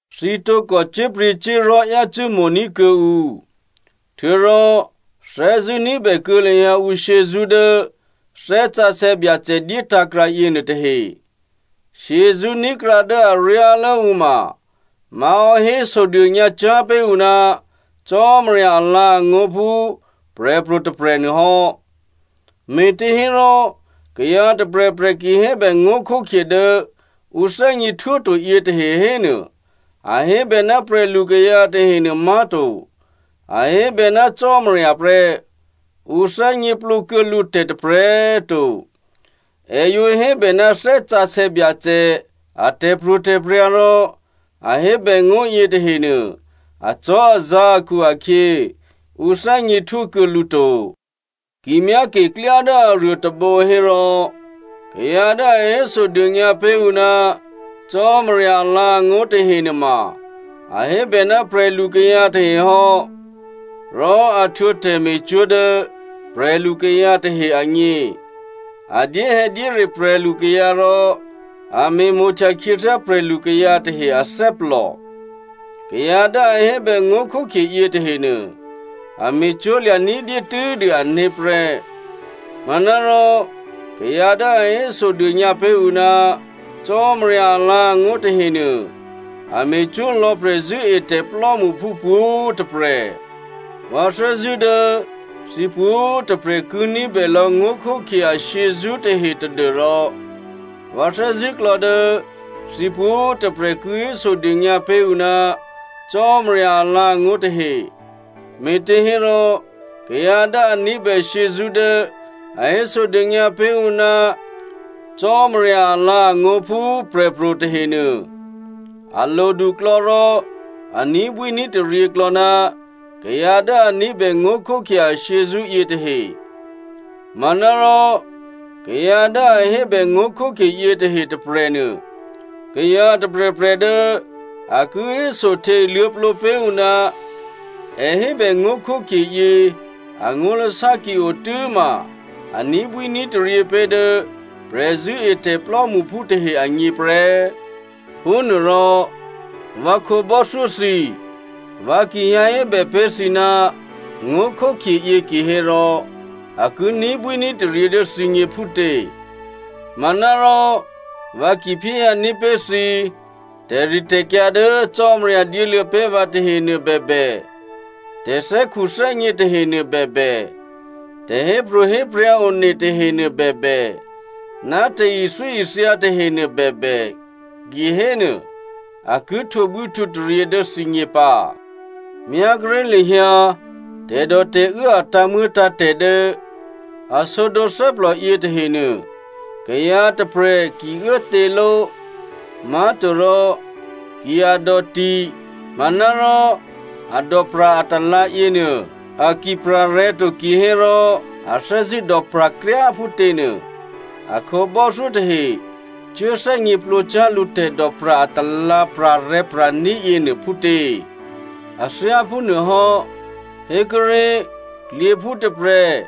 Thǐ tǒkò cyé̤pryě̤cyé̤li̤ yácû́ mo̤ní̤ kuô̌ǔ. Htuô̌rò thè́zṳ̂́ ní̤bè kuô̌ lahyǎ ǔ shyězṳ́ dố Thè́ Sǎsè̌ Byacè dyétǎ̤krǎ yěnuô tahe. Shyězṳ́ ní̤krǎ dố aryálố ǔ ma má̤hò́ hésodônyǎ cyá̤ pé̤ ǔ ná Cò́marya alǎ̤angó̤ phú prè̤pro̤ tôprè̤ nuôhò́. Me̤těhérò kayǎ tôprè̤prè̤ ki hébè ngó̤khókhye dố ǔ thè́gněhtwó to yětahe hénuô, a hébè ná prè̤lukayǎ tahenuô má̤to, a hébè ná Cò́marya prè́. Ǔ thè́gněplǒ kuô̌ lǔ tè̤ tôprè̤꤮ to. È yǒ hébè ná Thè́ Sǎsè̌ Byacè a tè̤pro̤tè̤prya̤ rò a hébè ngó̤ yětahenuô acò́azǎ̤ akhu-akhyě, ǔ thè́gněhtwó kuô̌ lǔ to. Ki myáke klyá dố aruô tôbǒ hérò, kayǎ dố a hésodônyǎ pé̤ ǔ ná Cò́marya alǎ̤angó̤ tahenuôma, a hébè ná prè̤lukayǎ tahe hò́, rò a htwǒ tè̤me̤cwó̤ dố prè̤lukayǎ tahe agně, a dyéhè̌dyére prè̤lukayǎ, rò a me̤mo̤htya khyěthyá prè̤lukayǎ tahe athè́plò. Kayǎ dố a hébè ngó̤khókhye yětahenuô a me̤cwó̤lya̤ ní̤dyé tû́dû ané̤ prè́. Manárò kayǎ dố a hésodônyǎ pé̤ ǔ ná Cò́marya alǎ̤angó̤ tahenuô, a me̤cwó̤ lò̌ prè̤zṳ̂́etè̤ plò́mṳphú pwǒ̤꤮ tôprè̤. Vǎ thè́zṳ̂́ dố thǐ pwǒ̤꤮ tôprè̤ ki ní̤bè lò̌ ngó̤khókhye ashyězṳ́ tahe tadû́rò vǎ thè́zṳ̂́klò̌ dố thǐ pwǒ̤꤮ tôprè̤ ki hésodônyǎ pé̤ ǔ ná Cò́marya alǎ̤angó̤ tahe. Me̤těhérò kayǎ dố a ní̤bè shyězṳ́ dố a hésodônyǎ pé̤ ǔ ná Cò́marya alǎ̤angó̤ phú prè̤pro̤ tahenuô, a loduklò̌ rò a ní̤bwíní̤taryě klò̌ ná kayǎ dố a ní̤bè ngó̤khókhye ashyězṳ́ yětahe. Manárò kayǎ dố a hébè ngó̤khókhye yětahe tôprè̤nuô, kayǎ tôprè̤prè̤ dố a ki hésohte luô̌plǒ pé̤ ǔ ná è hébè ngó̤khókhye yě angó̤lasá ki o tû́ma, a ní̤bwíní̤taryě pé̤ dố prè̤zṳ̂́etè̤ plò́mṳphú tahe agně prè́. Phúnuôrò vǎ khǒbò́thyó thǐ, vǎ ki hyǎ hébè pé̤ thǐ ná ngó̤khókhye yě kihérò a ki ní̤bwíní̤taryě dố thǐgně phútě? Manárò, vǎ ki phyéhyǎní̤ pé̤ thǐ tè̤ritè̤kyǎ dố Cò́marya dyéluô̌ pé̤ vǎ tahenuô bèbè, tè̤thè́khuthè́gně tahenuô bèbè, tè̤hépro̤héprya̤ one tahenuô bèbè, ná tè̤ithyóithya tahenuô bèbè, kihénuô, a ki htwǒbwíhtwǒtaryě dố thǐgně pǎ. Myá kuốré̤ lahyǎ tè̤dòtè̤uố a tǎ̤muô̌tǎ̤tè̤ dố a sǒdǒ thè́plò yětahenuô, kayǎ tôprè̤ ki uốtěló, má̤torò ki a dòti manárò a dòpra̤ atalǎ̤ yěnuô a ki pra̤ rè̤̌ to kihérò a thè́zṳ̂́ dòpra̤ kryá꤮ phútěnuô, a khǒbò́thyó tahe cuố thè́gněplǒcyá̤ lǔ tè̤dòpra̤ atalǎ̤ pra̤rè̤̌pra̤ní̤ yěnuô phútě? A thyá phúnuôhò́, hékuốré̤, klyěphú tôprè̤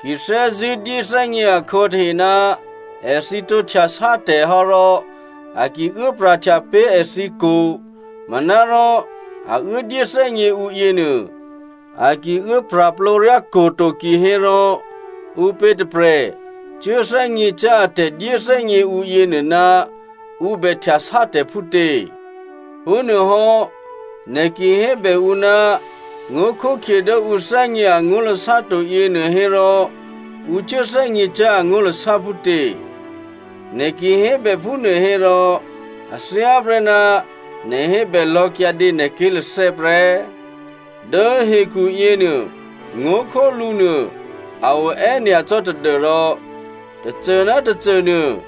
ki thè́zṳ̂́ dyéthè́gně akhǒ tahe ná èthǐ tǒ htyasátè̤ hò́ rò a ki uốpra̤htya pé̤ èthǐ kwo̤, manárò a uố dyéthè́gně ǔ yěnuô, a ki uố pra̤plǒ ryá kwo̤ to kihérò ǔpě tôprè̤ cuố thè́gněcyá̤ a tè̤dyéthè́gně ǔ yěnuô ná ǔ bè htyasátè̤ phútě? Phúnuôhò́ nè̤ ki hébè ǔ ná ngó̤khókhye dố ǔ thè́gně angó̤lasá to yěnuô hérò ǔ cuố thè́gněcyá̤ angó̤lasá phútě? Nè̤ ki hébè phúnuô hérò, a thyáprè́ ná nè̤ hébè lò̌ kyǎdě nè̤ ké̤lathè́ prè́. Dố hekhu yěnuô, ngó̤khólǔ nuô a o è́nyacò́ tadû́rò tôcô ná tôcô nuô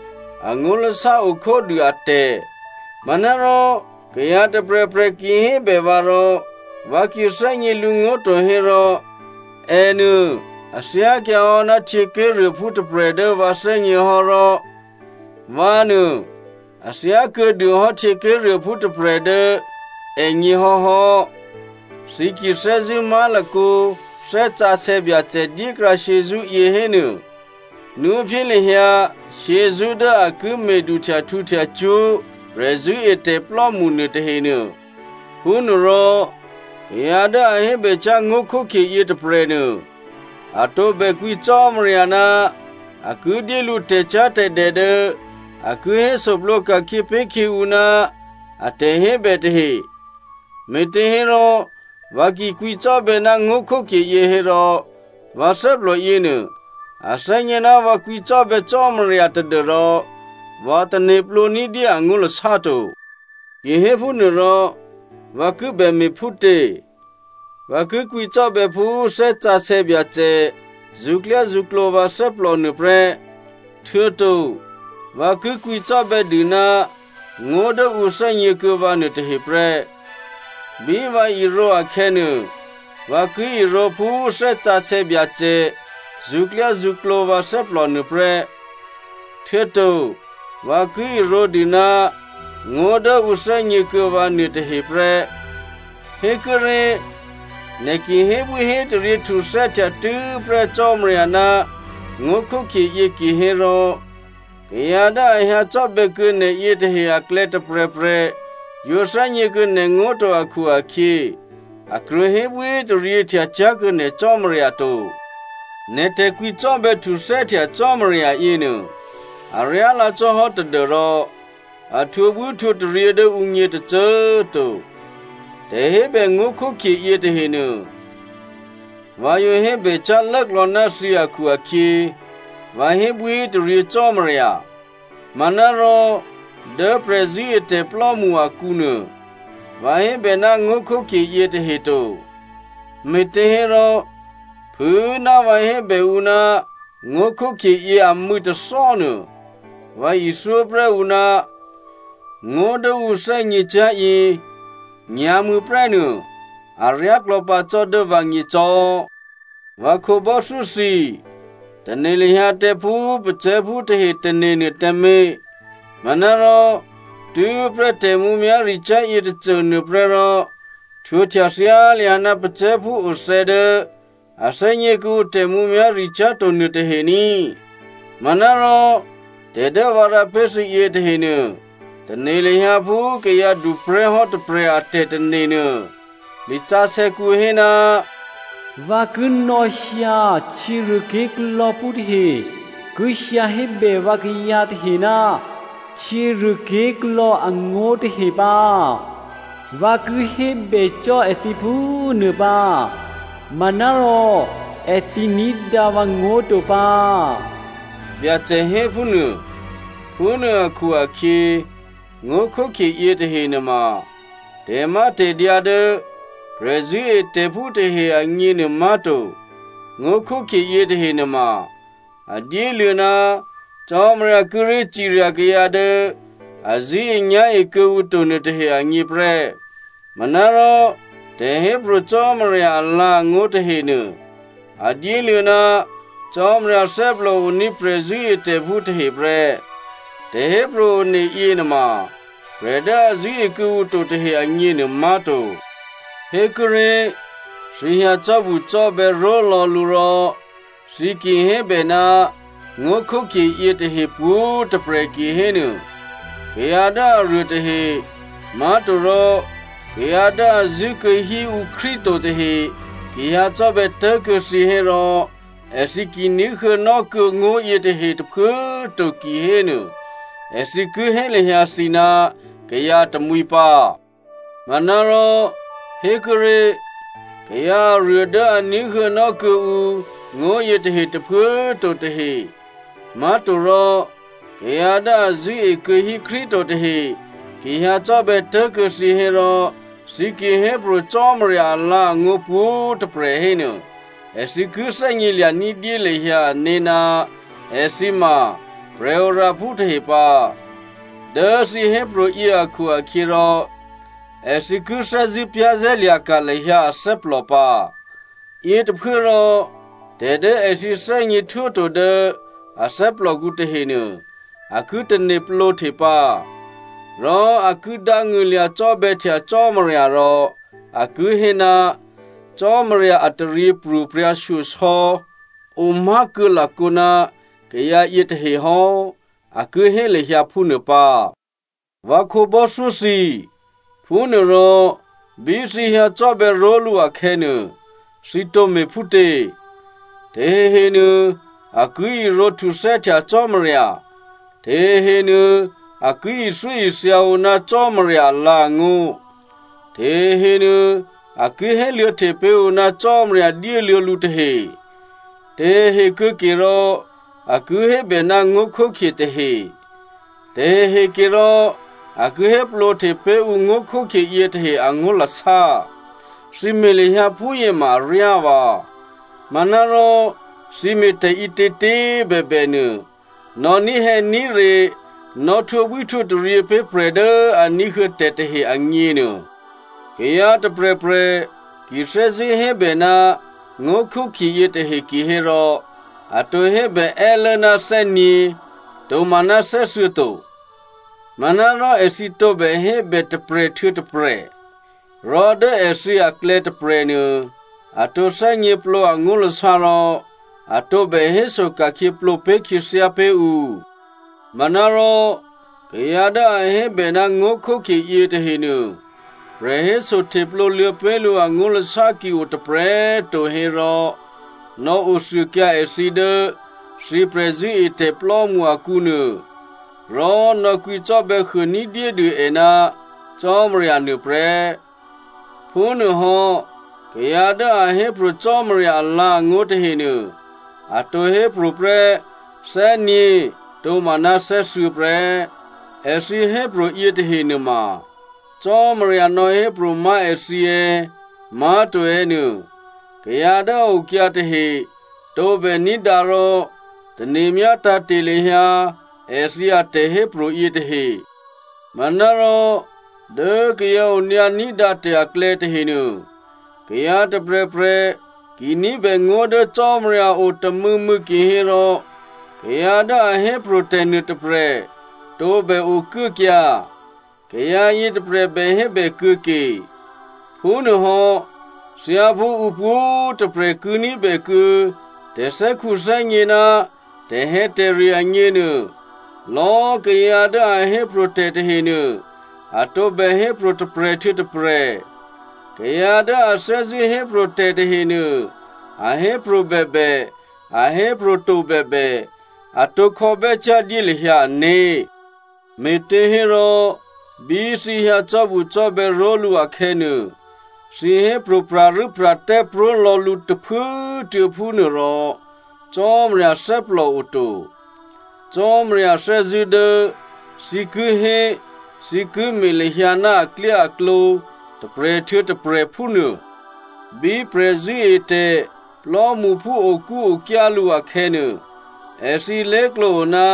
angó̤lasá o khódû atè̤. Manárò kayǎ tôprè̤prè̤ ki hébè vǎ rò vǎ ki thè́gně lǔngó̤ to hérò, ènuô a thyákyǎ hò́ ná htyěké̤ruôphú tôprè̤ dố vǎgně hò́, rò vǎnuô, a thyákuô̌dû hò́ htyěké̤ruôphú tôprè̤ dố ègně hò́hò́. Thǐ ki thè́zṳ̂́ má̤lakǒ Thè́ Sǎsè̌ Byacè dyékrǎ shyězṳ́ yě hénuô, nwóphyé lahyǎ shyězṳ́ dố a ki me̤ duhtyahtǔhtya cwó̤ prè̤zṳ̂́etè̤plò́mṳ nuôtahenuô. Phúnuôrò kayǎ dố a hébècyá̤ ngó̤khókhye yětôprè̤nuô, a tǒbè kwǐ Cò́marya ná a ki dyé lǔ tè̤cyá̤tè̤dè dố a ki hésoplǒ ka̤khyě pé̤ khyě ǔ ná a tè̤hébè tahe. Me̤těhérò, vǎ ki kwǐcò́bè̌ ná ngó̤khókhye yě hérò, vǎ thè́plò yěnuô a thè́gně ná vǎ kwǐcò́bè̌ Cò́marya tadû́rò vǎ tane̤plǒ ní̤dyé angó̤lasá to. Ki héphúnuôrò, vǎ kibè me̤ phútě? Vǎ ki kwǐcò́bè̌ phú Thè́ Sǎsè̌ Byacè zṳ̌klyázṳ̌klǒ vǎ thè́plò nuô prè́, htuô̌to vǎ ki kwǐcò́bè̌ dû ná ngó̤ dố ǔ thè́gně kuô̌ vǎ nuôtahe prè́. Bí vǎ irǒ akhè̌nuô, vǎ ki irǒ phú Thè́ Sǎsè̌ Byacè zṳ̌klyázṳ̌klǒ vǎ thè́plò nuô prè́, htuô̌to vǎ ki irǒdû ná ngó̤ dố ǔ thè́gně kuô̌ vǎ nuôtahe prè́. Hékuốré̤, nè̤ ki hébwíhétaryě htuthè́htya tû́prè́ Cò́marya ná ngó̤khókhye yě kihérò, kayǎ dố a hyǎcò́bè̌ kuô̌ nè̤ yětahe aklè̌ tôprè̤prè̤ yǒ thè́gně kuô̌ nè̤ngó̤ to akhu-akhyě, a krwǒ hébwíhétaryěhtya cyá̤ kuô̌ nè̤ Cò́marya to. Nè̤ tè̤kwǐcò́bè̌ htuthè́htya Cò́marya yěnuô, aryálǎ cò́ hò́ tadû́rò a htwǒbwíhtwǒtaryě dố ǔgně tôcô꤮ to. Tè̤hébè ngó̤khókhye yětahenuô, vǎ yǒ hébècyá̤ lốklò̌ ná thǐ akhu-akhyě vǎ hébwíhétaryě Cò́marya. Manárò dố prè̤zṳ̂́etè̤plò́mṳ akǔnuô, vǎ hébè ná ngó̤khókhye yětahe to. Me̤těhérò, phû꤮ ná vǎ hébè ǔ ná ngó̤khókhye yě amû̌ tôthò́ nuô, vǎ ithyó prè́ ǔ ná ngó̤ dố ǔ thè́gněcyá̤ yě nyǎ̤mû̌ prè́ nuô aryáklò̌ pǎ cò́ dố vǎgně cò́. Vǎ khǒbò́thyó thǐ, tane̤ lahyǎ tǎ phú pacè̤̌phú tahe tane̤ nuô tǎmé̤. Manárò tû́prè́ tè̤mǔmyá̤ricyá̤ yětôcô nuô prè́ rò htwǒhtya thyá lahyǎ ná pacè̤̌phú othè́ dố a thè́gně kuô̌ǔ tè̤mǔmyá̤ricyá̤ to nuôtahe ní꤮. Manárò tè̤ dố vǎ rǎ pé̤ thǐ yětahenuô, tane̤ lahyǎ phú kayǎduprè̤́ hò́ tôprè̤ a tè̤tane̤ nuô. Lisǎsè̌kǔ hé, “Vǎ ki nò̌hyǎ htyěruôké̤klò̌phú tahe ki hyǎ hébè vǎkayǎ tahe ná htyěruôké̤klò̌ angó̤ tahe pǎ. Vǎ ki hébè cò́ èthǐ phúnuô pǎ manárò èthǐ ní̤dǎ vǎ ngó̤ to pǎ,” Byacè hé phúnuô. Phúnuô akhu-akhyě, ngó̤khókhye yětahe nuôma tè̤mátè̤dyǎ dố prè̤zṳ̂́etè̤phú tahe agněnuô má̤to. Ngó̤khókhye yětahe nuôma a dyéluô̌ ná Cò́marya kíré̤ cirya kayǎ dố a zṳ̂́enyá̤e kuô̌ǔ to nuôtahe agně prè́. Manárò tè̤hépro̤ Cò́marya alǎ̤angó̤ tahenuô a dyéluô̌ ná Cò́marya thè́plòoní̤ prè̤zṳ̂́etè̤phú tahe prè́. Tè̤hépro̤ one yěnuôma prè̤ dố a zṳ̂́e kuô̌ǔ to tahe agněnuô má̤to. Hékuốré̤, thǐ hyǎ cò́bucò́bè̌ ró̤lò̌ lǔ rò thǐ ki hébè ná ngó̤khókhye yětahe pwǒ̤꤮ tôprè̤ kihénuô, kayǎ dố aruô tahe, má̤torò kayǎ dố a zṳ̂́ekuô̌ hí ǔ Krístu to tahe ki hyǎcò́bè̌ tố̤kuô̌ thǐ hérò èthǐ ki ní̤huô̌nò́ kuô̌ ngó̤ yětahe tôphuố꤮ to kihénuô èthǐ ki hé lahyǎ thǐ ná kayǎ tamwǐ pǎ. Manárò, hékuốré̤, kayǎ aruô dố a ní̤huô̌nò́ kuô̌ǔ ngó̤ yětahe tôphuố꤮ to tahe, má̤torò kayǎ dố a zṳ̂́e kuô̌hí Krístu to tahe ki hyǎcò́bè̌ tố̤kuô̌ thǐ hérò thǐ ki hépro̤ Cò́marya alǎ̤angó̤ pwǒ̤꤮ tôprè̤ hénuô, èthǐ ki thè́gnělya̤ ní̤dyé lahyǎ ané̤ ná èthǐ ma prè̤oraphú tahe pǎ. Dố thǐ hépro̤ yě akhu-akhyěrò èthǐ ki thè́zṳ̂́ za̤ lahyǎ ané̤ pǎ. Yětôphuốrò, tè̤ dố èthǐ thè́gněhtwóto dố a thè́plòkǔ tahenuô, a ki tane̤plǒhte pǎ, rò a ki dángṳ̂lya̤ cò́bè̌htya Cò́marya rò a ki hé, “Cò́marya a taryěpro̤prya̤ shyosò̌ omá̤kuô̌ lakǒ ná kayǎ yětahe hò́,” a ki hé lahyǎ phúnuô pǎ. Vǎ khǒbò́thyó thǐ, phúnuôrò bí thǐ hyǎcò́bè̌ ró̤lǔ akhè̌nuô, thǐ tǒ me̤ phútě? Tahehenuô a ki irǒ htuthè́htya Cò́marya, tahehenuô a ki ithyóithya ǔ ná Cò́marya alǎ̤angó̤, tahehenuô a ki héluô̌hte pé̤ ǔ ná Cò́marya dyéluô̌ lǔ tahe, tahehe kuô̌ke rò a ki hébè ná ngó̤khókhye tahe, tahehe ke rò a ki héplǒhte pé̤ ǔ ngó̤khókhye yětahe angó̤lasá. Thǐ me̤ lahyǎ phúyě ma aryá vǎ. Manárò thǐ me̤ tè̤ǐtětě꤮ bèbè nuô, nò̌ ní̤hè̌ní̤re, nò̌ htwǒbwíhtwǒtaryě pé̤ prè̤ dố a ní̤huô̌ tè̤ tahe agně nuô. Kayǎ tôprè̤prè̤ ki thè́zṳ̂́ hébè ná ngó̤khókhye yětahe kihérò, a tǒ hébè è́lố ná thè́nyě̤ tomaná thè́thuô̌ to. Manárò èthǐ tǒbè hébè tôprè̤ htuô̌ tôprè̤. Rò dố èthǐ aklè̌ tôprè̤nuô, a tǒ thè́gněplǒ angó̤lasá rò a tǒbè héso ka̤khyě plǒ pé̤ khyěthyá pé̤ ǔ. Manárò, kayǎ dố a hébè ná ngó̤khókhye yětahenuô, prè̤hésohteplǒ luô̌ pé̤ lǔ angó̤lasá ki o tôprè̤꤮ to hérò, nò̌othuôkyǎ èthǐ dố thǐ prè̤zṳ̂́etè̤plò́mṳ akǔnuô, rò nò̌kwǐcò́bè̌ huô ní̤dyédû è ná Cò́marya nuôprè́. Phúnuôhò́, kayǎ dố a hépro̤ Cò́marya alǎ̤angó̤ tahenuô, a tǒ hépro̤ prè́ thè́nyě̤ tomaná thè́thuô̌ prè́. Èthǐ hépro̤ yětahe nuôma Cò́marya nò̌hépro̤ má̤ èthǐ è̌, má̤to è̌ nuô, kayǎ dố a okyǎ tahe tǒbè ní̤dǎ rò tane̤myá tǎ̤te̤ lahyǎ èthǐ atè̤hépro̤ yětahe. Manárò, dố kayǎ onyǎní̤dǎ tè̤ aklè̌ tahenuô, kayǎ tôprè̤prè̤ ki ní̤bè ngó̤ dố Cò́marya o tômû̌mû̌ kihérò, kayǎ dố a hépro̤tè̤ nuôtôprè̤ tǒbè okuốkyǎ, kayǎ yětôprè̤ bè hébè kuô̌ke. Phúnuôhò́, thyáphú ǔ pwǒ̤꤮ tôprè̤ ki ní̤bè kuô̌ tè̤thè́khuthè́gně ná tè̤hè̌tè̤re agněnuô, lò̌꤮ kayǎ dố a hépro̤ tè̤ tahenuô, a tǒbè hépro̤ tôprè̤ htuô̌ tôprè̤. Kayǎ dố a thè́zṳ̂́ hépro̤ tè̤ tahenuô, a hépro̤ bèbè, a hépro̤to bèbè, a tǒ khò̌bè́cyá̤ dyé lahyǎ ané̤. Me̤těhérò, bí thǐ hyǎ cò́bucò́bè̌ ró̤lǔ akhè̌nuô, thǐ hépro̤ pra̤rû́pra̤tè́ pró̤ lò̌ lǔ tôphuốtuô̌ phúnuô rò Cò́marya thè́plò o to. Cò́marya thè́zṳ̂́ dố thǐ ki hé thǐ ki me̤ lahyǎ ná aklyáaklǒ tôprè̤ htuô̌ tôprè̤ phúnuô. Bí prè̤zṳ̂́etè̤ plò́mṳphú okúokyá lǔ akhè̌nuô, èthǐ lé̤klǒ o ná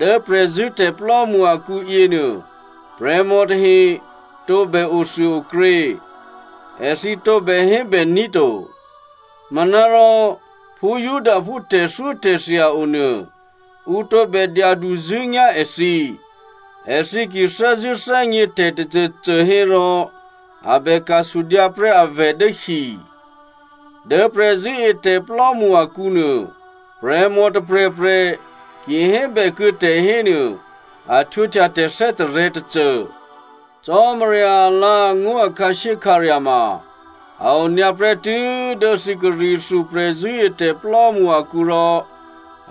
dố prè̤zṳ̂́tè̤ plò́mṳ akǔ yěnuô, prè̤mò tahe tǒbè othuôokrě. Èthǐ tǒbè hébèní̤ to. Manárò phú Judaphú tè̤thyótè̤thya o nuô, ǔ tǒbè dyaduzṳ̂́nyá̤ èthǐ. èthǐ ki thè́zṳ̂́ thè́gně tè̤tôcôcô hérò, a bè ka̤ sudyǎ prè́ avè̤ dố hi. Dố prè̤zṳ̂́etè̤plò́mṳ akǔnuô, prè̤mò tôprè̤prè̤ ki hébèkuô̌ tè̤ hénuô a htwǒhtya tè̤ thè́tarè̤̌ tôcô. Cò́marya alǎ̤angó̤ a khǎshyékhǎrya̤ ma a o nyǎ prè́tû́ dố thǐ Corinthia prè̤zṳ̂́etè̤plò́mṳ akǔ rò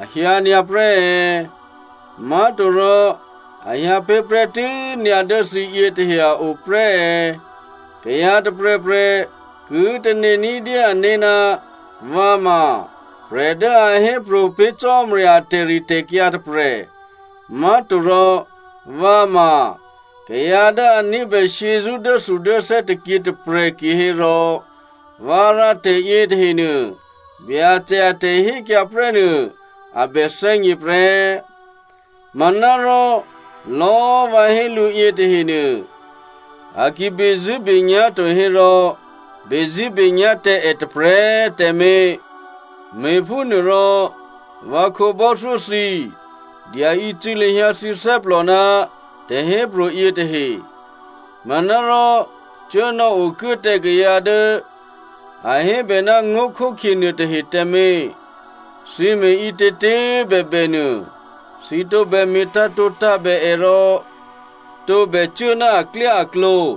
a hyǎ nyǎ prè́ è̌? Má̤torò a hyǎ pé̤ prè́tû́ nyǎ dố thǐ yětahe a o prè́ è̌? Kayǎ tôprè̤prè̤ ki tane̤ ní̤dyé ané̤, vǎ ma prè̤ dố a hépro̤ pé̤ Cò́marya a tè̤ritè̤kyǎ tôprè̤, má̤torò vǎ ma kayǎ dố a ní̤bè shyězṳ́ dốthudốthè́ tôkyě tôprè̤ kihérò vǎ rǎ tè̤ yětahenuô Byacè a tè̤hékyǎ prè́ nuô a bè thè́gně prè́. Manárò lò̌꤮ vǎ hé lǔ yětahenuô, a ki bezṳ̂́benyá̤ to hérò bezṳ̂́benyá̤ tǎ è tôprè̤꤮ tǎmé̤. Me̤phúnuôrò, vǎ khǒbò́thyó thǐ, dyaícû̌ lahyǎ thǐ thè́plò ná tè̤hépro̤ yětahe. Manárò cuố nò̌okuố tǎ kayǎ dố a hébè ná ngó̤khókhye nuôtahe tǎmé̤. Thǐ me̤ ǐtětě꤮ bèbè nuô, thǐ tǒbè me̤ tǎ̤tǒtǎ̤bè è rò tǒbè cuố ná aklyáaklǒ.